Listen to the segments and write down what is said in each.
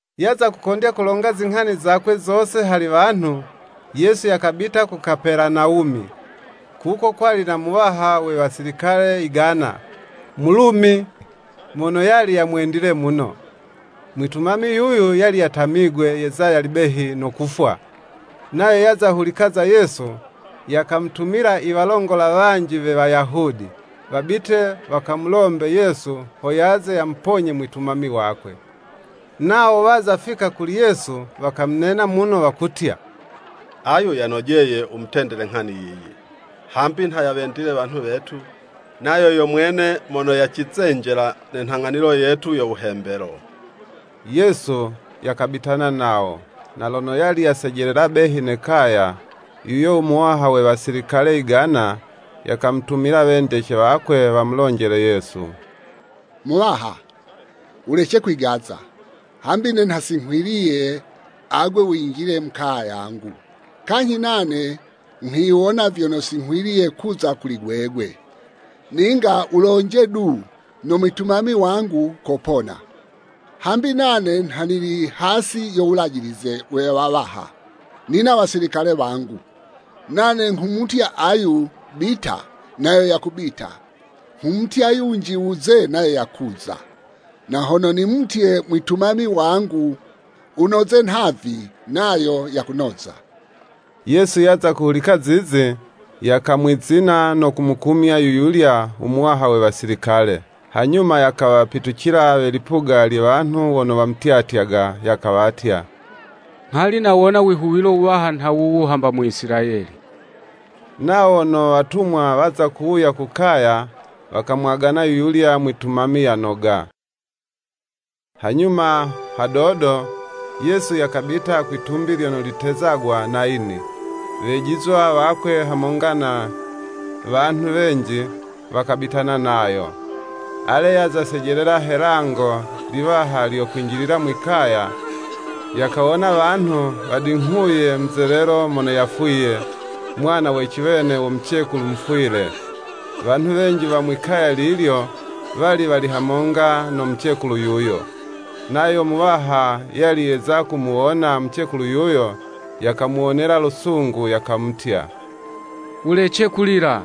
Yaza kukondya kulonga zinghani zakwe zose hali wanhu, Yesu yakabita ku Kapelanawumi. Kuko kwali na muwaha we wasilikale yigana, Mulumi, mono yali yena mwitumami wakwe mono yali yamwendile muno. Mwitumami yuyu yali yatamigwe yeza yali behi no kufwa. Nayo yaza hulika za Yesu, yakamutumila i walongola wanji we Wayahudi, wabite wakamulombe Yesu ho yaze yamuponye mwitumami wakwe. Nawo wazafika kuli Yesu, wakamunena muno, wakutya “Ayu yanojeye wumutendele nghani yiyi, hambi nha yawendile wanhu wetu, nayo yo mwene mono yacizenjela ne nhang'anilo yetu yo Wuhembelo.” Yesu yakabitana nawo. Na lono yali yasejelela behi ne kaya, yuyo muwaha we Wasilikale yigana, yakamutumila wendece wakwe wamulonjele Yesu. “Muwaha wulece kwigaza, hambi ne nha si nghwiliye agwe winjile mu kaya yangu. Kanyhi nane nghwiwona vyono si nghwiliye kuza kuli gwegwe; ninga wulonje du, no mwitumami wangu kopona. Hambi nane nha nili hasi yo wulajilize we wawaha, nina wasilikale wangu. Nane nghumutya ayu, ‘Bita’ nayo yakubita, nghumutya yunji, ‘Wuze’ nayo yakuza, na hono nimutye mwitumami wangu, ‘Wunoze nhavi,’ nayo yakunoza.” Yesu yaza kuhulika zizi, yakamwizina no kumukumya yuyulya u muwaha we wasilikale. Hanyuma yakawapitucila we lipuga lye wanhu wono wamutyatyaga, yakawatya. “Nghali nawona wihuwilo wuwaha nha wuwu, hamba mu Isilayeli.” Nawo wono watumwa waza kuwuya ku kaya, wakamwagana yuyulya mwitumami yanoga. Hanyuma hadodo, Yesu yakabita kwitumbi lyono litezagwa Nayini, Wejizwa wakwe hamonga na wanhu wenji, wakabitana nayo. Ale, yaza sejelela he 'lango liwaha lyo kwinjilila mwi'kaya, yakawona wanhu wadinghuye muzelelo mono yafwiye, mwana we ciwene wo mucekulu mufwile. Wanhu wenji wa mwi'kaya lilyo, wali wali hamonga no mucekulu yuyo. Nayo Muwaha yali yeza kumuwona mucekulu yuyo, yakamuwonela lusungu, yakamutya, “Wulece kulila.”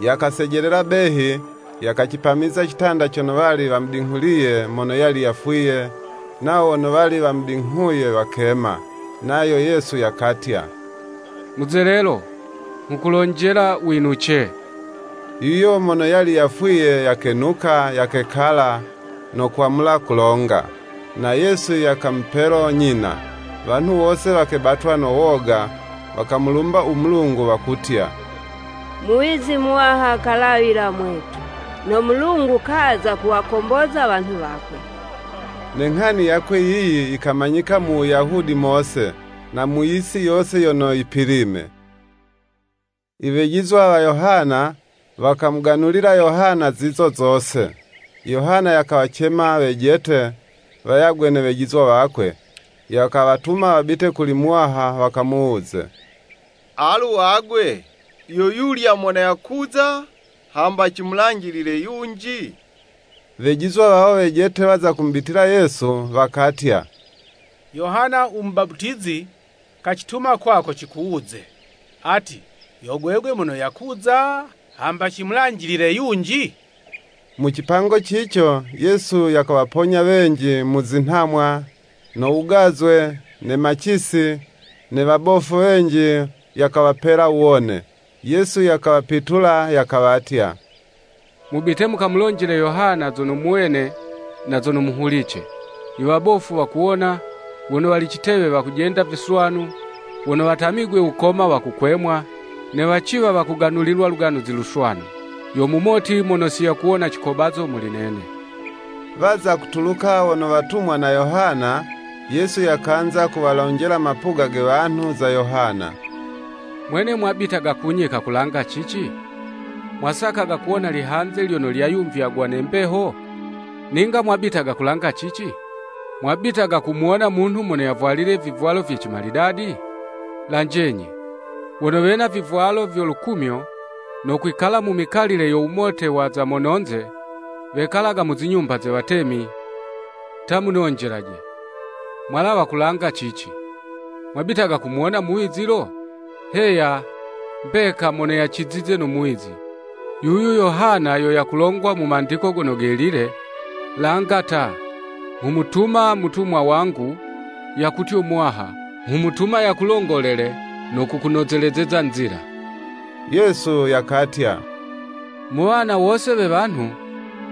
Yakasejelela behi, yakacipamiza citanda cono wali wamudinghuliye mono yali yafwiye, nawo wono wali wamudinghuye wakema. Nayo Yesu yakatya, “Muzelelo, nghukulonjela, Winuce.” Yuyo mono yali yafwiye, yakenuka, yakekala, no kwamula kulonga. Na Yesu yakamupelo nyina. Wanhu wose wakebatwa no woga, wakamulumba u Mulungu, wakutya, “Muwizi muwaha kalawila mwetu; no Mulungu kaza kuwakomboza wanhu wakwe.” Ne nghani yakwe yiyi yikamanyika mu Wuyahudi mose, na mu yisi yose yono yipilime. I wejizwa wa Yohana, wakamuganulila Yohana zizo zose, Yohana yakawacema wejete, wayagwe ne wejizwa wakwe, yakawatuma wabite kuli Muwaha wakamuwuze “Alu agwe! Yo yulya mono yakuza, hamba cimulanjilile yunji?” Wejizwa wawo wejete waza kumubitila Yesu, wakatya, “Yohana u Mubaputizi kacituma kwako cikuwuze: ‘Ati! Yo gwegwe mono yakuza, hamba cimulanjilile yunji?'" Mu cipango cico, Yesu yakawaponya wenji mu zinhamwa, no wugazwe, ne macisi, ne wabofu wenji yakawapela wuwone. Yesu yakawapitula yakawatya, “Mubite mukamulonjele Yohana zono muwene na zono muhulice; i wabofu wakuwona, wono wali citewe wakujenda viswanu, wono watamigwe wukoma wakukwemwa, ne waciwa wakuganulilwa u Luganuzi Luswanu. Yo mumoti mono si yakuwona cikobazo muli nene.” Waza kutuluka wono watumwa na Yohana, Yesu yakanza kuwalonjela mapuga ge wanhu, za Yohana. “Mwene mwabitaga kunyika kulanga cici?” Mwasakaga kuwona lihanze lyono lyayumvywagwa ne mbeho? Ninga mwabitaga kulanga cici? Mwabitaga kumuwona munhu mono yavwalile vivwalo vye cimalidadi? Lanjenyi, wono wena vivwalo vyo lukumyo, no kwikala mu mikalile yo wumote wa za mononze, wekalaga mu zinyumba ze watemi! Ta munonjelaje, mwalawa kulanga cici, Mwabitaga kumuwona muwizi lo? Heya, mbeka mono yamucizize no muwizi. Yuyu Yohana yo yakulongwa mu Mandiko Gono Gelile, “Langa ta, nghumutuma mutumwa wangu, yakutyo Muwaha, nghumutuma yakulongolele no kukunozelezeza nzila.” Yesu yakatya, “Mu wana wose we wanhu,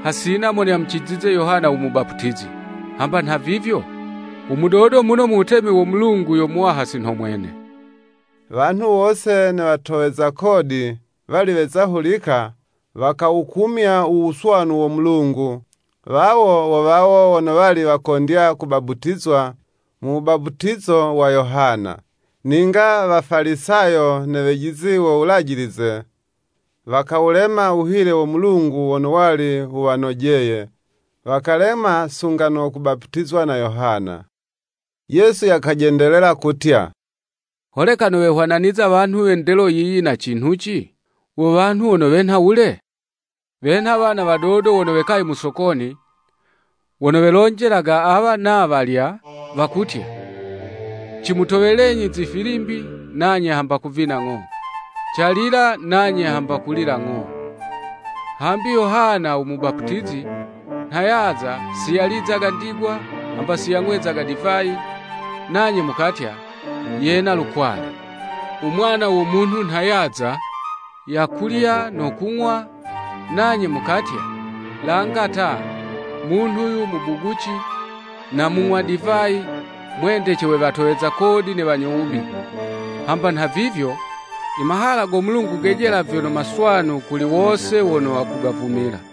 hasina mono yamucizize Yohana u Mubaputizi. Hamba nhavivyo, u mudodo muno mu wutemi wo Mulungu yo muwaha si nho mwene.” Wanhu wose ne watoweza kodi, wali weza hulika, wakawukumya u wuswanu wo Mulungu, wawo wo wawo, wono wali wakondya kubaputizwa mu wubaputizo wa Yohana. Ninga Wafalisayo ne wejizi wo Wulajilize, wakawulema wuhile wo Mulungu wono wali wuwanojeye, wakalema sunga no kubaputizwa na Yohana. Yesu yakajendelela kutya: “Holeka nowehwananiza wanhu we ndelo yiyi na cinhuci? Wo wanhu wono wenha wule? Wenha wana wadodo wono wekaye mu Sokoni, wono welonjelaga awa na walya; wakutya, Cimutowelenyi zifilimbi, nanye hamba kuvina ng'o, calila nanye hamba kulila ng'o. Hambi Yohana u Mubaputizi nha yaza si yalizaga ndigwa, hamba si yang'wezaga divayi, nanye mukatya, Yena lukwale. U Mwana wo Munhu nha yaza, yakulya no kung'wa, nanye mukatya, Langa ta munhu 'yu mubuguci, na mung'wa divayi, mwendece we watoweza kodi ne wanyo wubi! Hamba nhavivyo, I mahala go Mulungu gejela vyono maswanu kuli wose wono wakugavumila.”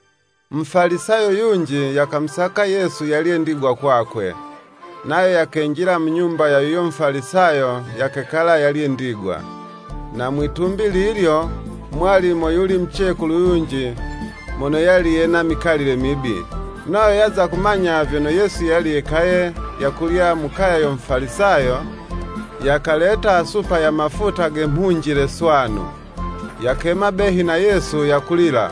Mufalisayo yunji yakamusaka Yesu yalye ndigwa kwakwe. Nayo yakenjila mu nyumba ya yuyo Mufalisayo yakekala yalye ndigwa. Na mwitumbi lilyo, mwali moyuli mucekulu yunji mono yali yena mikalile mibi. Nayo yaza kumanya vyono Yesu yali yekaye yakulya mu kaya yo Mufalisayo, yakaleta supa ya mafuta ge mhunjile swanu, yakema behi na Yesu, yakulila,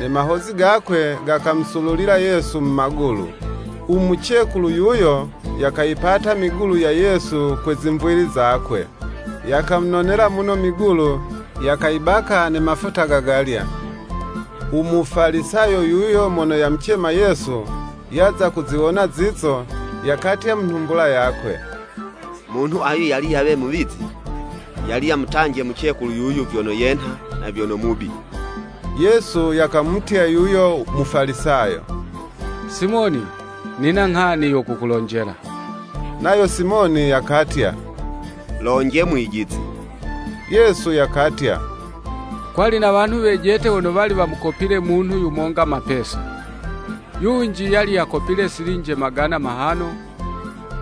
ne mahozi gakwe gakamusululila Yesu mu magulu. U Mucekulu yuyo yakayipata migulu ya. Yesu kwe zimvili zakwe. Yakamunonela muno migulu, yakawabaka ne mafuta gagalya. U Mufalisayo yuyo mono yamucema Yesu, yaza kuziwona zizo, yakatya mu nhumbula yakwe, “Munhu ayu yali yawe muwizi, yali yamutanje mucekulu yuyu vyono yenha na vyono mubi.” Yesu yakamutya yuyo Mufalisayo “Simoni nina nghani yo kukulonjela.” Nayo Simoni yakatya, “Lonje Mwijizi.” Yesu yakatya “Kwali na wanhu wejete wono wali wamukopile munhu yumonga mapesa. Yunji yali yakopile silinje magana mahano,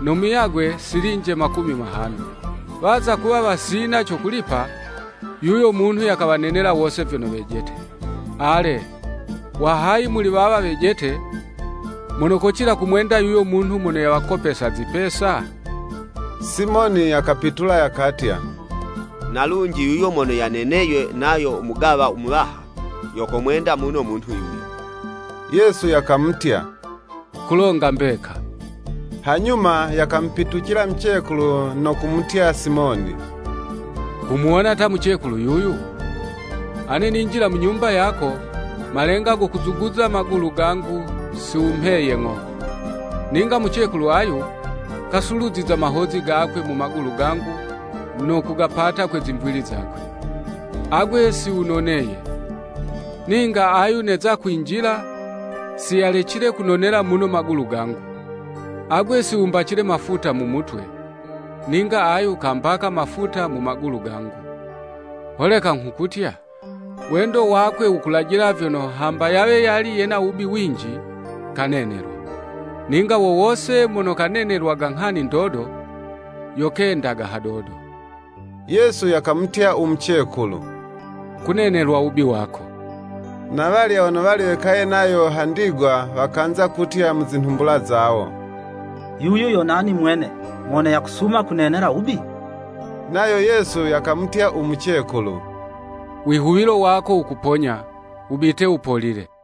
no muyagwe, silinje makumi mahano. Waza kuwa wasina co kulipa, yuyo munhu yakawanenela wose vyono wejete. Ale, wa hayi muli wawa wejete, mono kocila kumwenda yuyo munhu mono yawakopesa zipesa?” Simoni yakapitula yakatya, na lunji, yuyo mono yaneneywe nayo mugawa muwaha, yo komwenda muno munhu yuyo. Yesu yakamutya “Kulonga mbeka.” Hanyuma yakamupitucila mucekulu, no kumutya Simoni, “Kumuwona ta mucekulu yuyu? Ane ninjila mu nyumba yako, malenga go kuzuguza magulu gangu, si wumheye ng'o. Ninga mucekulu ayu, kasuluziza mahozi gakwe mu magulu gangu no kugapata kwe zimvili zakwe. Agwe si wunoneye; ninga ayu neza kwinjila, si yalecile kunonela muno magulu gangu. Agwe si wumbacile mafuta mu mutwe: ninga ayu kambaka mafuta mu magulu gangu. Holeka nghukutya, wendo wakwe wukulajila vyono, hamba yawe yali yena wubi winji, kanenelwa. Ninga wowose mono kanenelwaga nghani ndodo, yo kendaga hadodo.” Yesu yakamutya u mucekulu, “Kunenelwa wubi wako.” Na walya wono wali wekaye nayo ha ndigwa, wakanza kutya mu zinhumbula zawo “Yuyu yo nani mwene, mono yakusuma kunenela wubi?” Nayo Yesu yakamutya u mucekulu, “Wihuwilo wako wukuponya; wubite wupolile.”